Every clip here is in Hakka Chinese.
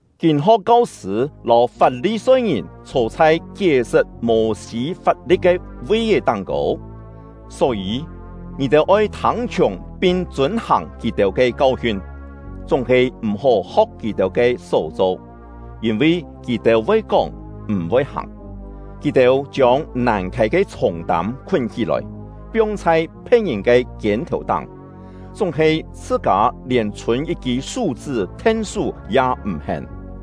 “Kîn-ho̍k kau-sṳ̂ lâu Fap-li-soi-ngìn chhô chhai kié-sṳt Mô-sî fap-li̍t ke vi-é táng-kô, só-yî, ngì-têu oi thâng-chhiùng pin chûn-hàng kì-têu ke kau-hiun; chúng-he m̀-hó ho̍k kì-têu ke só-cho, yîn-vi kì-têu voi kóng, m̀-voi hàng. Kì-têu chiông nàn khâi ke chhûng-tâm khún hí-lòi, piong chhai phe̍t-ngìn ke kiên-thèu-táng, chúng-he chhṳ-kâ lièn chhûn yit-kî sú-chṳ́ then-sú ya m̀-hén.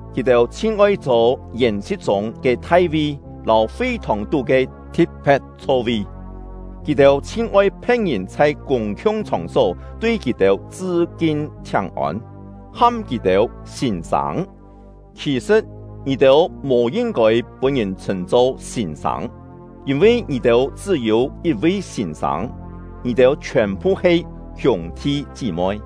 kì-têu chhin oi chhô yèn-si̍t chûng ke thai-vi lâu fi-thòng-tú ke thi̍t-phe̍t chho-vi; kì-têu chhin oi phe̍t-ngìn chhai kûng-khiung chhòng-só tui kì-têu chṳ-kin chhiáng-ôn, ham kì-têu ‘Sîn-sâng’. Khì-sṳ̍t, ngì-têu mò yin-kôi pûn-ngìn chhṳ̂n-cho ‘Sîn-sâng’, yîn-vi ngì-têu chṳ́-yû yit-vi Sîn-sâng; ngì-têu chhiòn-phu he hiûng-thi chí-moi.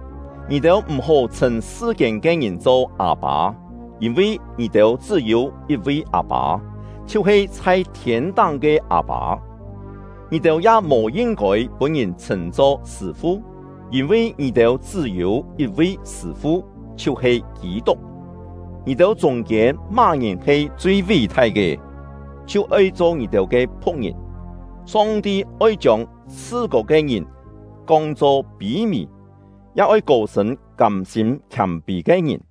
Ngì-têu m̀-hó chhṳ̂n sṳ-kiên ke ngìn cho ‘Â-pâ’, yîn-vi ngì-têu chṳ́-yû yit-vi Â-pâ, chhiu-he chhai thiên-táng ke Â-pâ. “Ngì-têu ya mò yin-kôi pûn-ngìn chhṳ̂n-cho ‘Sṳ̂-fu’, yîn-vi ngì-têu chṳ́-yû yit-vi Sṳ̂-fu, chhiu-he Kî-tuk. Ngì-têu chûng-kiên má-ngìn he chui ví-thai ke, chhiu oi cho ngì-têu ke phu̍k-ngìn. Song-ti oi chiông chhṳ-kô ke ngìn kong-cho pî-mì, ya oi kô-sṳ̂n kâm-sîm khiâm-pî ke ngìn.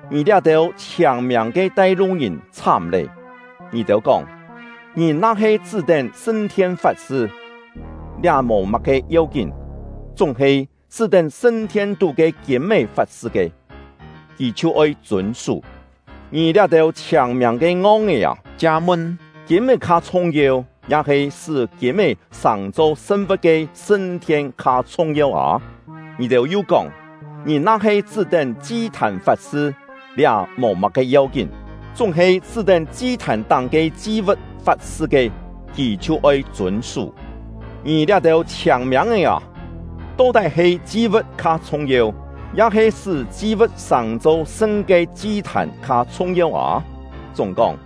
“Ngì liá-têu chhiâng-miâng ke tai-lu-ngìn chhám lé! Ngì-têu kóng: ‘Ngìn na-he chṳ́-tén sṳn-thien fat-sṳ, liá mò má-ke yeu-kín; chúng-he chṳ́-tén sṳn-thien-tú ke kîm-é fat-sṳ ke, kì chhiu oi chûn-sú.’ Ngì liá-têu chhiâng-miâng ke ngong-é â! Chia-mun, kîm-é kha chhung-yeu? Ya-he sṳ́ kîm-é sàng-cho sṳn-vu̍t ke sṳn-thien kha chhung-yeu â? Ngì-têu yu kóng: ‘Ngìn na-he chṳ́-tén chi-thàn fat-sṳ, liá mò má-ke yeu-kín; chúng-he chṳ́-tén chi-thàn-táng ke chi-vu̍t fat-sṳ ke, kì chhiu oi chûn-sú.’ Ngì liá-têu chhiâng-miâng-é â! To-tái he chi-vu̍t kha chhung-yeu? Ya-he sṳ́ chi-vu̍t sàng-cho sṳn ke chi-thàn kha chhung-yeu â? Chúng-kóng,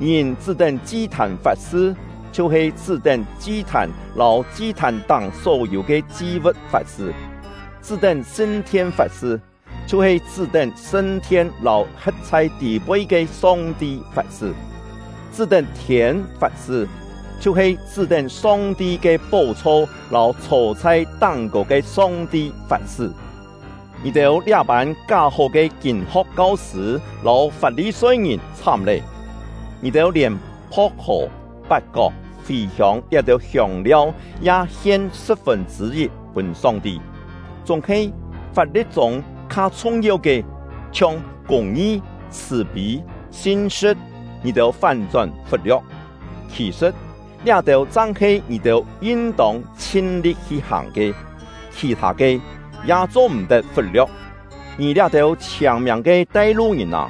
ngìn chṳ́-tén chi-thàn fat-sṳ, chhiu-he chṳ́-tén chi-thàn lâu chi-thàn-táng só-yû ke chi-vu̍t fat-sṳ; chṳ́-tén sṳn-thien fat-sṳ, chhiu-he chṳ́-tén sṳn-thien lâu he̍t chhai tî-poi ke Song-ti fat-sṳ; chṳ́-tén thiên fat-sṳ, chhiu-he chṳ́-tén Song-ti ke pó-chho lâu chhô chhai táng-kô ke Song-ti fat-sṳ. “Ngì-têu liá-pân ká-hó ke kîn-ho̍k kau-sṳ̂ lâu Fap-li-soi-ngìn chhám lé! Ngì-têu lièn pho̍k-hò, pat-kok, fì-hiông liá-têu hiông-liau ya hien sṳ̍p-fûn chṳ̂-yit pûn Song-ti; chúng-he fap-li̍t-chûng kha chhung-yeu ke, chhiong kûng-ngi, chhṳ̀-pî, sin-sṳ̍t, ngì-têu fán-chón fut-lio̍k. Khì-sṳ̍t, liá-têu chang he ngì-têu yin-tông chhin-li̍t hi-hàng ke; khì-thâ ke, ya cho-m̀-tet fut-lio̍k. Ngì liá-têu chhiâng-miâng ke tai-lu-ngìn â!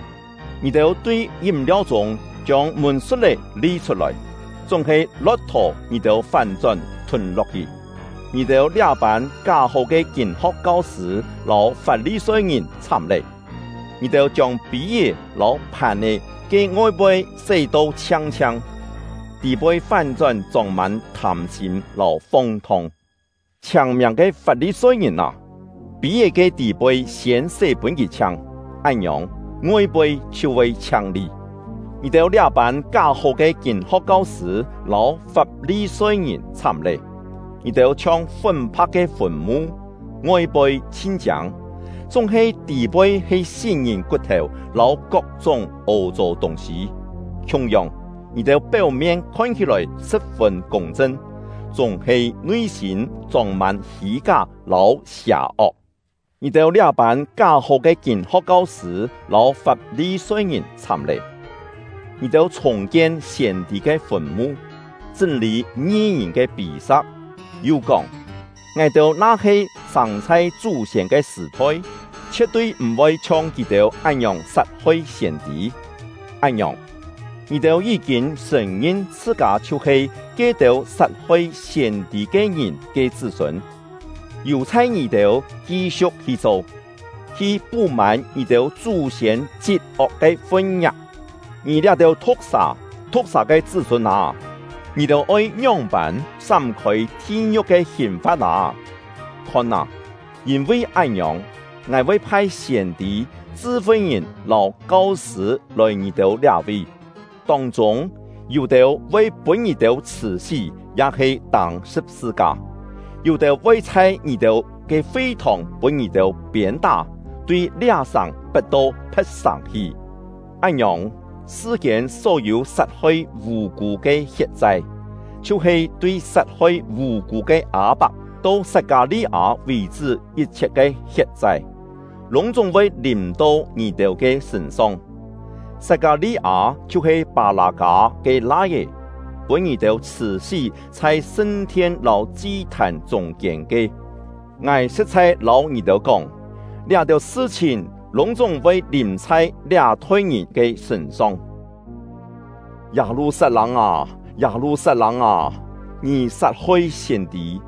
Ngì-têu tui yím-liau-chûng chiông mûn-sut-é li-chhut-lòi, chúng-he lo̍k-thò ngì-têu fán-chón thûn-lo̍k-hi! “Ngì-têu liá-pân ká-hó ke kîn-ho̍k kau-sṳ̂ lâu Fap-li-soi-ngìn chhám lé! Ngì-têu chiông pî-é lâu phàn-è ke ngoi-poi sé-to chhiang-chhiang, tî-poi fán-chón chông-mân thâm-sîm lâu fong-thong. Chhiâng-miâng ke Fap-li-soi-ngìn â! Pî-é ke tî-poi siên sé pûn kì chhiang, án-ngiòng, ngoi-poi chhiu voi chhiang-li. “Ngì-têu liá-pân ká-hó ke kîn-ho̍k kau-sṳ̂ lâu Fap-li-soi-ngìn chhám lé! Ngì-têu chhiong fún-pha̍k ke fùn-mu, ngoi-poi chhin chiâng, chúng-he tî-poi he sí-ngìn kut-thèu lâu kok-chúng ô-chô tûng-sî. Khiung-yong, ngì-têu péu-mien khon hí-lòi sṳ̍p-fûn kûng-chṳn, chúng-he nui-sîm chông-mân hî-ká lâu sià-ok. “Ngì-têu liá-pân ká-hó ke kîn-ho̍k kau-sṳ̂ lâu Fap-li-soi-ngìn chhám lé! Ngì-têu chhùng-kien siên-tî ke fùn-mu, chṳ́n-lî ngi-ngìn ke pî-sa̍k, yu kóng: ‘Ngài-têu na-he sâng chhai chú-siên ke sṳ̀-thoi, chhie̍t-tui m̀-voi chhiong kì-têu án-ngiòng sat-hoi siên-tî!’ Án-ngiòng, ngì-têu yí-kîn sṳ̀n-ngin chhṳ-kâ chhiu-he ke-têu sat-hoi siên-tî ke ngìn ke chṳ́-sûn! Yù-chhai ngì-têu ki-siu̍k hi cho, hi pú-mân ngì-têu chú-siên chit-ok ke fun-ngiak! Ngì liá-têu thu̍k-sà, thu̍k-sà ke chṳ́-sûn â, ngì-têu oi ngióng-pân sám-khôi thi-ngiu̍k ke hìn-fa̍t â? Khon â! Yîn-vi án-ngiòng, ngài voi phai siên-tî, chṳ-fi-ngìn lâu kau-sṳ̂ lòi ngì-têu liá-vi; tông-chûng, yû-têu voi pûn ngì-têu chhṳ̀-sí ya-he tâng sṳ̍p-sṳ-ka, yû-têu voi chhai ngì-têu ke fi-thòng pûn ngì-têu piên-tá, tui liá-sàng pet-to phe̍t sàng hi. Án-ngiòng, sṳ-kiên só-yû sat-hoi vù-kû ke hiet-chai, chhiu-he tui sat-hoi vù-kû ke Â-pak to Sat-kâ-li-â vì-chṳ́ yit-chhiet ke hiet-chai, lûng-chúng voi lìm chhai ngì-têu ke sṳ̂n-song. Sat-kâ-li-â chhiu-he Pâ-lâ-kâ ke lai-é, pûn ngì-têu chhṳ̀-sí chhai sṳn-thien lâu chi-thàn chûng-kiên ke. Ngài sṳ̍t-chhai lâu ngì-têu kóng, liá-têu sṳ-chhìn lûng-chúng voi lìm chhai liá-thoi ngìn ke sṳ̂n-song. “Yâ-lu-sat-lâng â! Yâ-lu-sat-lâng â! Ngì sat-hoi siên-tî,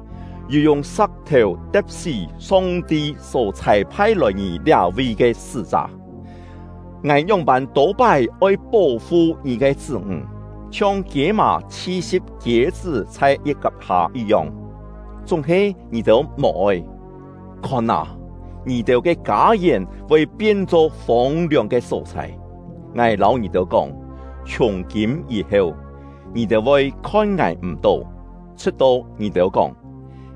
yu yung sa̍k-thèu te̍p-sí Song-ti só chhâi-phai lòi ngì liá-vi ke sṳ́-chá! Ngài ngióng-pân tô-pái oi pó-fu ngì ke chṳ́-ńg, chhiong kiê-mà chhi-si̍p kiê-chṳ́ chhai yi̍t-kap hâ yit-yong; chúng-he ngì-têu mò-oi! Khon â, ngì-têu ke kâ-yèn voi pien-cho fông-liòng ke só-chhai. Ngài lâu ngì-têu kóng, chhiùng-kîm yî-heu, ngì-têu voi khon ngài m̀-tó, chhṳ̍t-to ngì-têu kóng: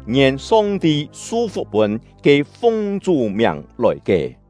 ‘Ngien Song-ti su-fuk pûn ke fung Chú miàng lòi ke!’”